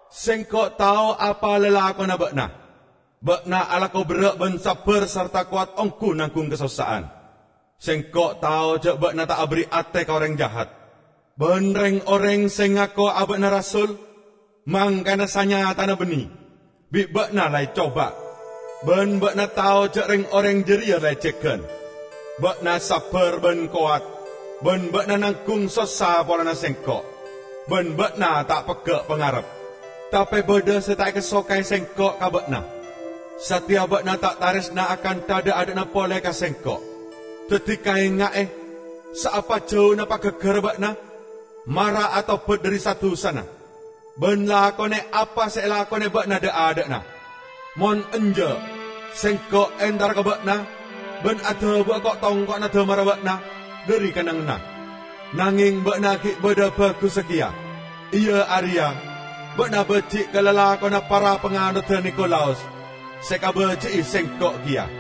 Sengko' tao apa lalakonna ba'na: Ba'na alako berra' ban sabbar sarta kowat onggu nanggung kasossa'an. Sengko' tao ja' ba'na ta' aberri' ate ka oreng jahat. Ban reng-oreng se ngako aba'na rasul, mangkana sanyatana banne, bi' ba'na la ecoba, ban ba'na tao ja' reng-oreng jareya lecegan. Ba'na sabbar ban kowat ban ba'na nanggung sossa polana Sengko', ban ba'na ta' pegga' pangarep. Tape badha se ta' ekasoka'e Sengko' ka ba'na: sateya ba'na ta' taresna akantha dha'-adha'na pole ka Sengko'. Daddi kaenga'e, saapa jauna pagaggarra ba'na! Mara atobat dhari sa-dusana, ban lakone apa se elakone ba'na dha'-adha'na. Mon enja', Sengko' entara ka ba'na ban adabu'a ko'-tongko'na damarra ba'na dhari kennengnganna. Nangeng ba'na gi' badha bagussa keya, iya areya: Ba'na baji' ka lalakonna para panganodda Nikolaus, se ekabaji'i Sengko' keya.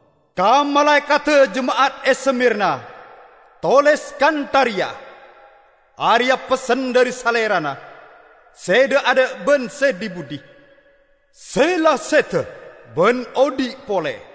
"Ka malaekadda jema'at e Smirna, toles kantha reya: Areya' pessen dhari Salerana se dha'-adha' ban se dhi-budhi -- se la seda ban odhi' pole.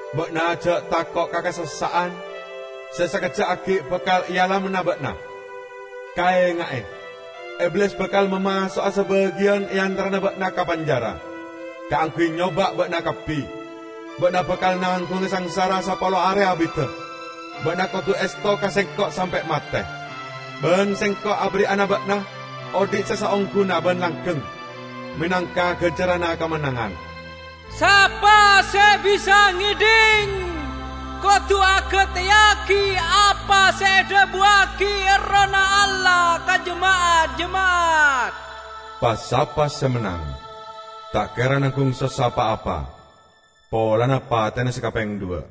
Ba'na ja' tako' ka kasossa'an se sakejja' aggi' bakal ealamana ba'na. Kaenga'e, Iblis bakal mamaso'a sabagiyan e antarana ba'na ka penjara kaangguy nyoba' ba'na kabbi. Ba'na bakal nanggunga sangsara sapolo are abidda. Ba'na kodu esto ka Sengko' sampe' mate, ban Sengko' aberri'ana ba'na odhi' se saongguna ban langgeng menangka ganjaranna kamennangan. Sapa se bisa ngedhing, kodu agateyagi apa se edhabuwagi Errohna Allah ka jema'at-jema'at! Pa-sapa se mennang, ta' kera nanggung sossa pa-apa polana patena se kapeng dhuwa'."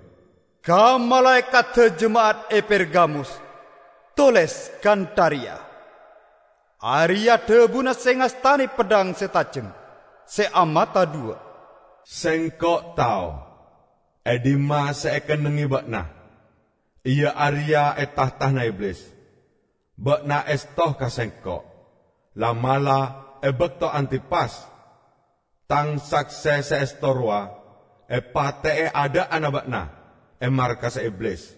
Ka malaekadda jema'at e Pergamus toles kantha reya: Areya' dhabuna se ngastane peddhang se tajem se amata dhuwa'. Sengko' tao e dhimma se ekennengnge ba'na, iya areya e tahtana Iblis. Ba'na esto ka sengko'. La'-mala' e bakto Antipas, Tang sakse se esto rowa, epate'e adha'anna ba'na e markassa Iblis,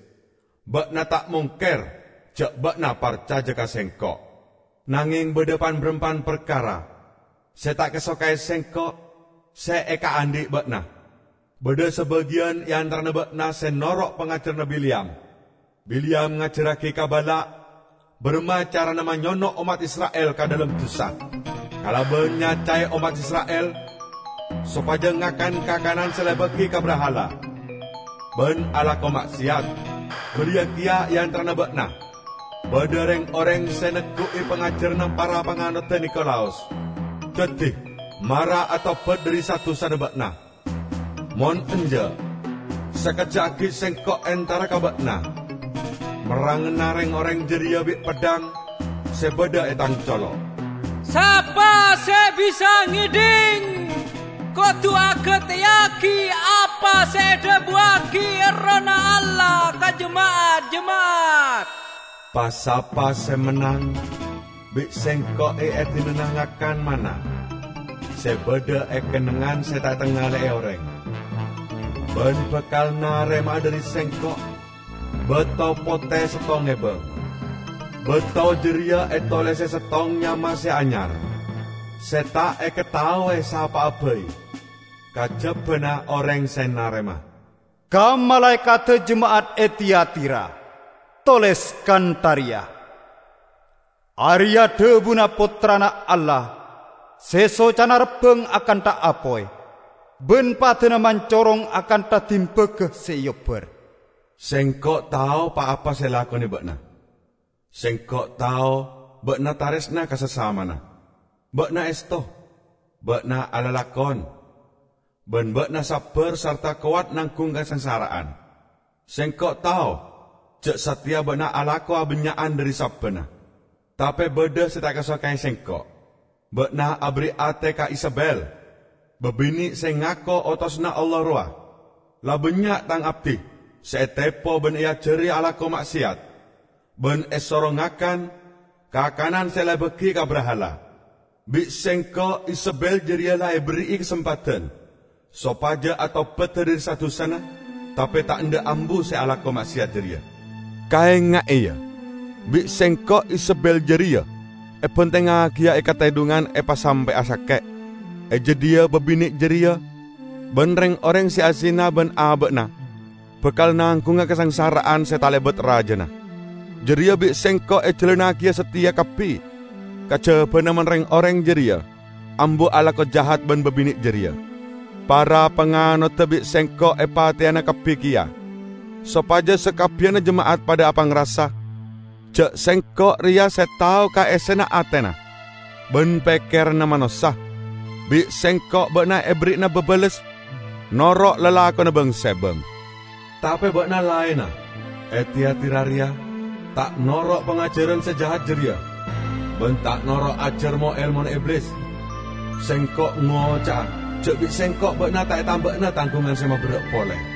ba'na ta' mongker ja' ba'na parcaja ka Sengko'. Nangeng badha pan-barampan parkara se ta' ekasoka'e Sengko' se ekaandhi' ba'na: Badha sabagiyan e antarana ba'na se noro' pangajaranna Bileyam. Bileyam ngajarragi ka Balak baramma carana manyono' ommat Isra'il ka dhalem dusa; kalaban nyacae ommat Isra'il sopaja ngakan kakanan se la ebagi ka brahala ban alako ma'seyat. Bariya keya e antarana ba'na badha reng-oreng se neggu'i pangajaranna para panganodda Nikolaus. Daddi, mara atobat dhari sa-dusana ba'na. Mon enja', sakejja' aggi' Sengko' entara ka ba'na merrangana reng-oreng jareya bi' peddhang se badha e Tang colo'. Sapa se bisa ngedhing, kodu agateyagi apa se edhabuwagi Errohna Allah ka jema'at-jema'at. Pa-sapa se mennang, bi' Sengko' eedinana ngakan manna se badha e kennengngan se ta' etangale'e oreng, ban bakal narema'a dhari Sengko' bato pote settong ebang. Bato jareya etolese settong nyama se anyar, se ta' ekataowe sapa'a bai, kajabana oreng se narema. Ka malaekadda jema'at e Tiatira, toles kantha reya: Areya' dhabuna Pottrana Allah, se socana rabbang akantha apoy, ban padana mancorong akantha dimbaga se eobbar. Sengko' tao pa-apa se elakone ba'na -- Sengko' tao ba'na taresna ka sasamana, ba'na esto, ba'na alalakon, ban ba'na sabbar sarta kowat nanggung kasangsara'an. Sengko' tao ja' sateya ba'na alako abannya'an dhari sabbanna. Tape badha se ta' ekasoka'e Sengko': Ba'na aberri' ate ka Izebel, babine' se ngako otosanna Allah rowa. La bannya' Tang abdi se etepo ban eajari alako ma'seyat ban esoro ngakan kakanan se la ebagi ka brahala. Bi' Sengko' Izebel jareya la eberri'i kasempadan sopaja atobada dhari sa-dusana, tape ta' endha' ambu se alako ma'seyat jareya. Kaenga'e, ya, bi' Sengko' Izebel jareya ebantengngagiya e katedhungan epasampe'a sake'; e jadhiya babine' jareya ban reng-oreng se azina ban aba'na bakal nanggunga kasangsara'an se talebat rajana. Jareya bi' Sengko' ejalannagiya sateya kabbi kajabana mon reng-oreng jareya ambu alako jahat ban babine' jareya. Para panganodda bi' Sengko' epateyana kabbi keya sopaja sakabbiyanna jema'at padha apangrasa ja' Sengko' reya se tao ka essena atena ban pekkeranna manossa. Bi' Sengko' ba'na eberri'ana babales noro' lalakonna bang-sebang. Tape ba'na laenna e Tiatira reya ta' noro' pangajaran se jahat jareya, ban ta' noro' ajar mo-elmona Iblis. Sengko' ngoca'a ja' bi' Sengko' ba'na ta' etamba'ana tanggungan se maberra' pole.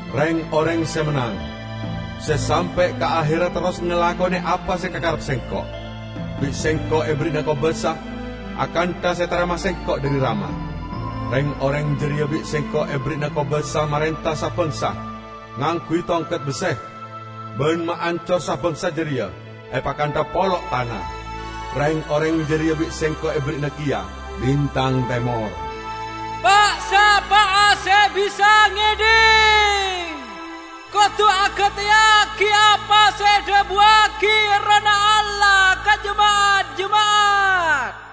Reng-oreng se mennang, se sampe' ka aherra terros ngalakone apa se ekakarep Sengko', bi' Sengko' eberri'ana kobasa akantha se etarema Sengko' dhari Rama. Reng-oreng jareya bi' Sengko' eberri'ana kobasa marenta sa-bangsa ngangguy tongket besse, ban maancor sa-bangsa jareya epakantha polo' tana. Reng-oreng jareya bi' Sengko' eberri'ana keya bintang temor. Pa'-sapa'a se bisa ngedhing, kodu agateyagi apa se edhabuwagi Errohna Allah ka jema'at-jema'at!